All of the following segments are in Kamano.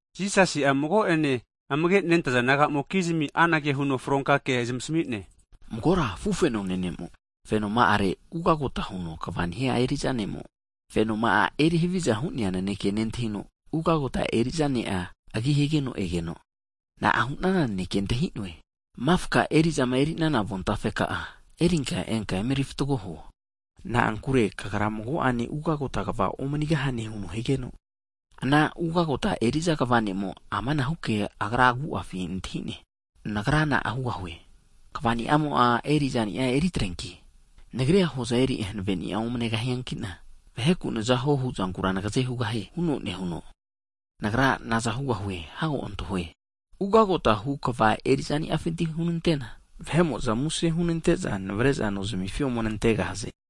Jisasi'a, mago'ene amage nentaza disaipol naga'amokizmi anage huno fronka kea zamasmi'ne, Magora afufenone ne'mo'a, fenoma'are ugagota huno kva nehia eri'za ne'mo, fenoma'a eri havia hu'nea nanekea, nentahino ugagota eri'za ne'a agi higeno egeno, na'a hu'nana naneke antahi'noe? Mafka eri'zama eri'nana avontafe ka'a erinka enka eme erifatgo huo. Na'ankure kagra mago'ene ugagota kva omanigahane huno higeno, ana ugagota eri'za kva ne'mo'a amanahu ke agra'a agu'afina antahi'ne, na'a nagra hugahue. Kva ni'amo'a eri'za ni'a eri atreanki? Nagrira hoza eri hanaveni'a omnegahiankina vaheku nzahuo huzankura nagaze hugahie huno nehuno, Nagra naza hugahue hago antahue, ugagotahu kva eri'za'niafinti hunante'na, vahe'mo'za muse hunante'za navare'za nozmifi ome nantegahaze.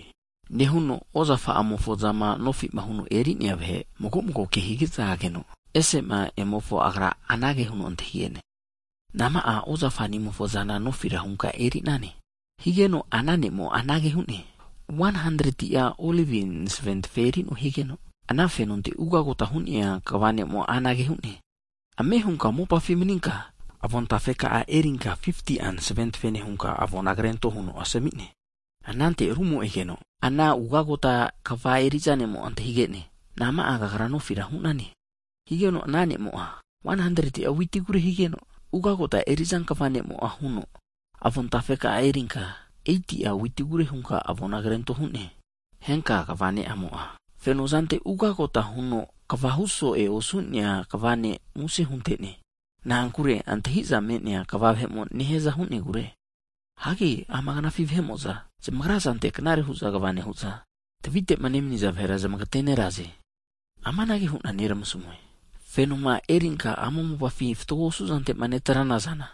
Nehuno ozafa'amofo zama nofi huno eri'nea vahe, mago mago ke higeza ageno, ese'ma emofo agra anage huno antahige'ne, nama'a ozafa'nimofo'zana nofira hunka eri'nane? Higeno ana ne'mo'a anage hu'ne, 100'a Olivi masaventafe eri'noe higeno, ana fenonte ugagota hu'nea kva ne'mo anage hu'ne, ame hunka mopafi maninka avontafeka'a erinka 50'a masaventafene hunka avona krento huno asami'ne. Anante rumo egeno ana ugagota kva eri'za ne'mo antahige'ne, Nama'a kagra nofira hu'nane? Higeno ana ne'mo'a 100'a witigure higeno, ugagota eri'za kva nemo'a huno avon tafe erinka 80'a witigure hunka avona krento hu'ne. Henka kva ne'mo'a, fenozante ugagota huno kvahu so'e osu'nea kva ne' muse hunte'ne. Na'ankure antahiza me'nea kva vahemo nehiaza hu'negure. Hagi ama knafi havizama nehaza vahe'mo'za zamagra zantera knare hu'za kva nehu'za, tavi masare'ma nemaniza vahera zamagateneraze. Amanage hu'na Nagra neramasmue, fenoma erinka ama mopafi fatgo osu'zante'ma netrana zana,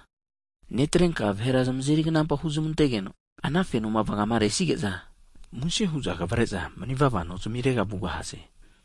netrenka ana zanteti vahera zamazeri knampa huzmante'negeno, ana fenoma vagama resige'za, muse hu'za kavare'za mani vava nonkuma zamirega vugahaze.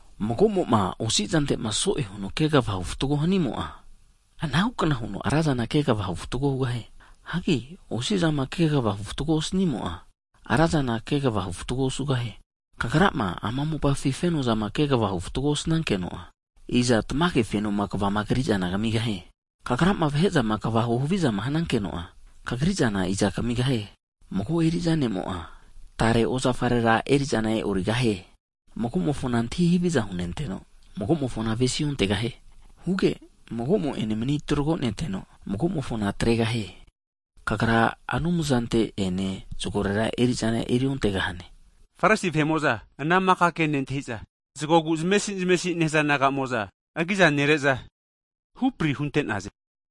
Mago'mo'ma osi'zantema so'e huno kegavahu fatgo hanimo'a, anahu kna huno ra zana kegavahu fatgo hugahie. Hagi osi'zama kegavahu fatgo osanimo'a, ra zana kegavahu fatgo osugahie. Kagrama ama mopafi fenozama kegavahu fatgo osnankeno'a, iza tamage fenoma kvama kri'zana kamigahie? Kagrama vahe'zama kegava huhaviza hanankeno'a, kagri'zana iza kamigahie. Mago eri'za ne'mo'a tare ozafarera eri'zana e'origahie. Mago'mofona antahi haviza hunenteno, mago'mofona avesi antegahie. Huge mago'mo'ene mani tragoneteno, mago'mofona atregahie. Kagra Anumzante ene zagorera eri'zana eriontegahane. Farisi vahe'mo'za ana maka ke nentahi'za, (zagogu zamesi zamesi nehaza naga'mo'za) agiza nere'za, hupri hunte'naze.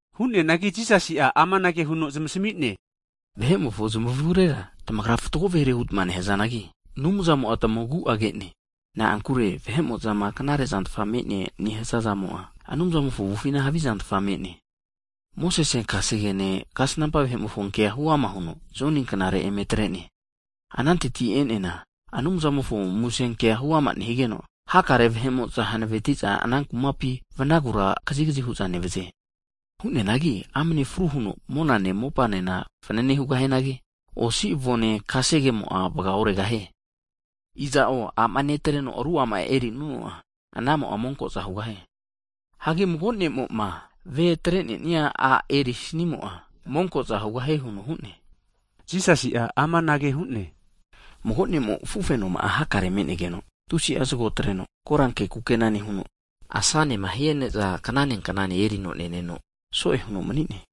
Hu'neanagi Jisasi'a amanage huno zamasmi'ne, Vahe'mofo zamavurera tamagra fatgo vahere hutma nehazanagi, Anumzamo'a tamagu'a ke'ne. Na'ankure vahe'mo'zama knarezantfa me'ne nehaza'zamo'a, Anumzamofo avufina havizantfa me'ne. Mosese kasegene, kasnampa vahe'mofo kea huama huno Joni knare eme atre'ne. Hagi ananteti'ma e'neana Anumzamofo kumamofo musenke huama nehigeno, hakare vahe'mo'za hanaveti'za ana kumapi vanagura kazigazi hu'za nevaze. Hu'neanagi amane fru huno monane, mopanena fanane hugahianagi, kasege kefima me'nea osi avomo'a vaga oregahie. Iza'o a'ma netreno ru a'ma erinuno'a, anamo'a monko'za hugahie. Hagi mago ne'mo'ma, ve'a atre'nesi'a a' erisanimo'a, monkoza hugahie huno hu'ne. Jisasi'a amanage hu'ne, Mago ne'mo afufenoma'a hakare me'negeno tusi'a zago atreno, koranke kukena nehuno, asanema nehia ne'za knane knane erino neneno, so'e huno mani'ne.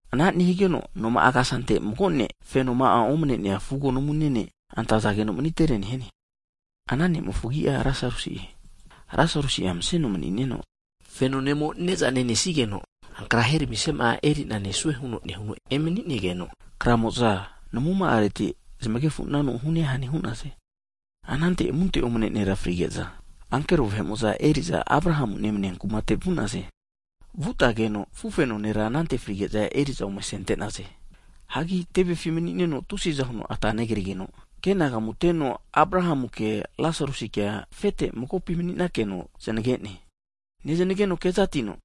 Ana nehigeno noma'a kasante mago nera fenoma'a omane'nea fugo namune ne' antazageno manitere nehiane. Ana ne'mofo agi'a Lasarusi'e. Lasarusi'a maseno mani'neno, feno ne'mo'ma ne'za nenesigeno ankra heramisiama'a erina nesue huno nehuno emani'negeza, kramo'za namuma'areti zamaganefu'nanu hu'ne hane hu'naze. Anante amunte omane nera frige'za, ankero vahe'mo'za eri'za Abrahamu nemania kumate vu'naze. Vutageno afufeno nera anante frige'za eri'za ome asentageno, hagi tevefi manineno tusiza huno ata negrigeno kenagamuteno Abrahamuke Lasarusikea, afete magopi mani'nakeno zanage'ne. Neznageno kezatino,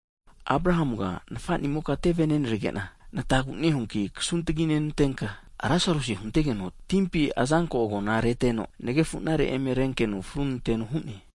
Abrahamuga nafa'nimoka teve nenrege'na natagu nehuanki kasuntagi nantenka, Lasarusina huntegeno timpi azanko agona'a reteno nagefu'nare eme rentenkeno fru hunanteno hu'ne.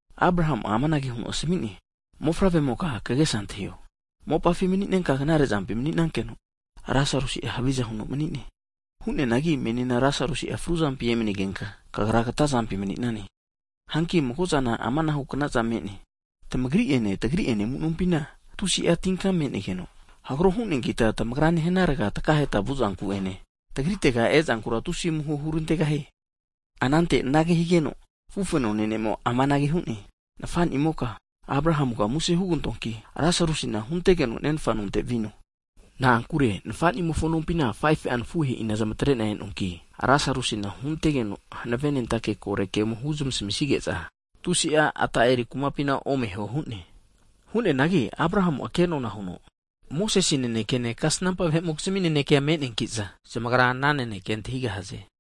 Abrahamu'a amanage huno asmi'ne, Mofavre'moka kagesa antahio. Mopafi mani'nenka knare zampi mani'nankeno Lasarusi'a haviza huno mani'ne. Hu'neanagi menina Lasarusi'a fruzampi emani'negenka kagra kata zampi mani'nane. Hanki mago'zana amanahu kna'za me'ne. Tamagri'ene tagri'ene amu'nompina tusi'a tinka me'negeno, hagro hu'neankita tamagritegama takaheta vu'zanku'ene tagritega ezankura tusi'a amuho hurantegahie. Anante anage higeno, afufenone ne'mo'a amanage hu'ne. Nafa'nimoka Abrahamuga muse hugantoanki Lasarusina huntegeno nenfa nontega vino, na'ankure nafa'nimofo nompina 5fu'a nafuhe'ina zamatre'na e'noanki, Lasarusina huntegeno hanave'nentake kore ke ome huzmasamisige'za tusi'a ata eri kumapina omeho hu'ne. Hu'neanagi Abrahamu'a kenona huno, Moses nanekene kasnampa vahe'mokizmi nanekea me'neanki'za zamagra ana nanekea antahigahaze.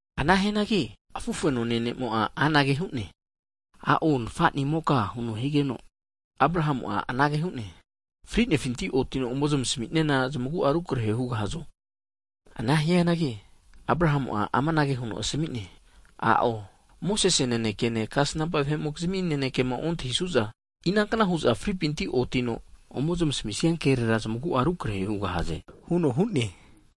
Ana hianagi afufenoma'ane ne'mo'a anage hu'ne, a'o nafa'nimoke higeno, Abrahamu'a anage hu'ne, frinefinti otino ome zamasamisiana zamagu'a rukrahera hugahazo! Anage hianangi Abrahamu amanage huno asami'ne, I'o. Moses nanekene, kasnampa vahe'mokizmi nanekema nontahisu'za, inankna hu'za fripinti otino ome zamasami'nia kerera zamagu'a rukrehe hugahaze huno hu'ne.